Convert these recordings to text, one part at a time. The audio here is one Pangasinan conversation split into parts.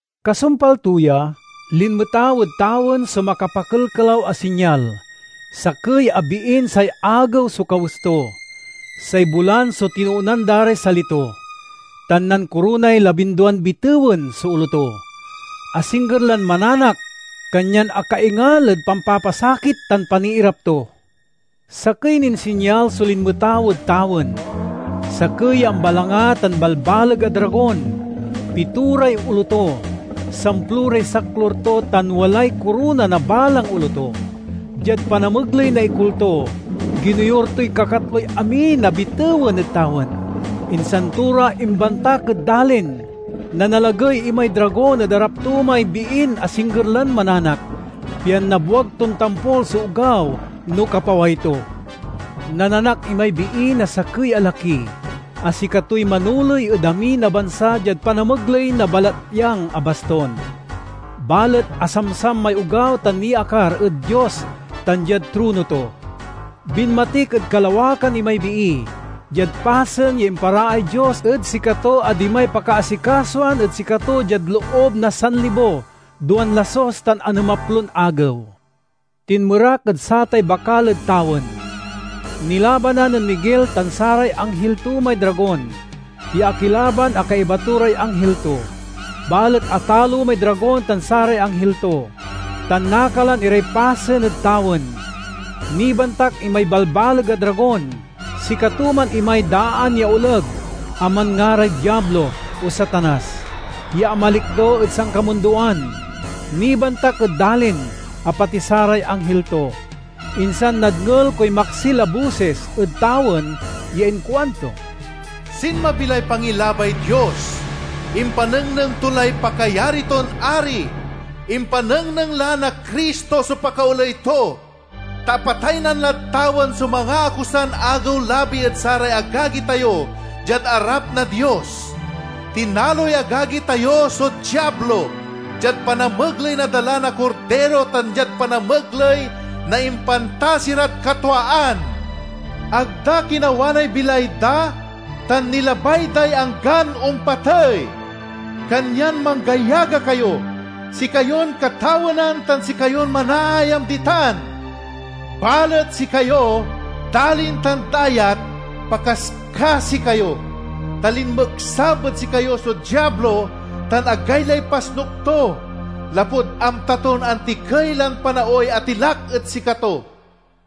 Kasumpal to ya, linmetaw ed tawen so makapakelkelaw a sinyal: sakey a biin say agew so kawes to, say bulan so tinoonan da ray sali to, tan nankoronay labinduan bitewen so olo to. Asingger lan mananak, kanyan akaingal ed pampapasakit tan paniirap to. Sakey nin sinyal so linmetaw ed tawen: sakey ya ambalanga tan balbaleg a dragon. Pitoray olo to, samploray saklur to, tan walay korona na balang olo to. Diad panamegley na ikul to, ginoyur toy kakatloy amin a bitewen ed tawen, insan to ra imbantak ed dalin. Nanalagey imay dragon ed arap to may biin asingger lan mananak, pian nabwag ton tampol so ogaw no kapaway to. Nananak imay bii na sakey a laki, a sikatoy manoley ed amin a bansa diad panamegley na balatyang a bastun. Balet asamsam may ogaw tan niakar ed Dios tan diad trono to. Binmatik ed kalawakan imay bii, diad pasen ya imparaay Dios ed sikato a dimay pakaasikasoan ed sikato diad loob na sanlibo, duan lasus tan anemaplon agew. Tinmerak ed satay bakal ed tawen! Nilabanan nen Miguel tan saray anghil to may dragon, ya akilaban a kaiba to ray anghil to. Balet atalo may dragon tan saray anghil to, tan nakalan iray pasen ed tawen. Nibantak imay balbaleg a dragon! Sikato man imay daan ya oleg a manngaray Diablo, o Satanas, ya amalikdo ed sankamundoan. Nibantak ed dalin, a pati saray anghil to. Insan nadngel koy maksil a bosis ed tawen ya inkuanto, "Sinmabi lay pangilabay Dios! Impanengnengto lay pakayari ton Ari! Impanengneng la na Cristo so pakaoley to! Ta apataynan lad tawen so mangaakusan agew-labi ed saray agagi tayo, diad arap na Dios. Tinaloy agagi tayo so Diablo, diad panamegley na dala na Kordiro tan diad panamegley na impantasi rad katwaan; ag da kinawanay bilay da tan nilabay day anggan ompatey. Kanyan manggayaga kayo, sikayon katawenan tan sikayon manaayam ditan! Balet sikayo, dalin tan dayat, pakaskasi kayo! Ta linmeksab ed sikayo so Diablo tan agaylay pasnuk to, lapud amta ton antikey lan panaoy atilak ed sikato."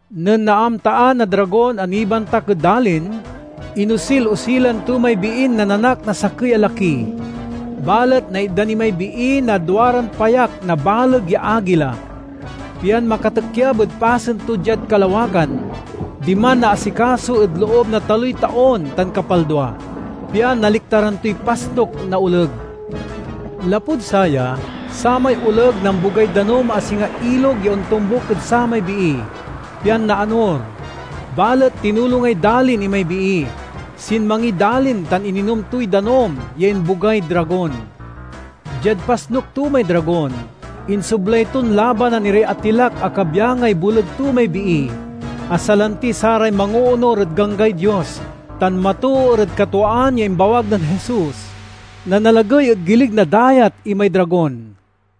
Nen naamtaan na dragon a nibantak ed dalin, inosil-osilan to may biin nananak na sakey a laki. Balet naitdan imay bii na duaran payak na baleg ya agila, pian makatikyab ed pasen to diad kalawakan. Diman naasikaso ed loob na taloy taon tan kapaldua, pian naliktaran toy pasnuk na oleg. Lapud saya, samay oleg nambogay danum a singa ilog ya ontombuk ed samay bii, pian naanor. Balet tinulongay dalin imay bii; sinmangiy dalin tan ininom toy danum ya imbogay dragon. Diad pasnuk to may dragon, insoblay ton labanan iray atilak a kabyangay boleg to may bii, a salanti saray mangoonur ed ganggay Dios tan matoor ed katwaan ya imbawag nen Jesus. Nanalagey ed gilig na dayat imay dragon.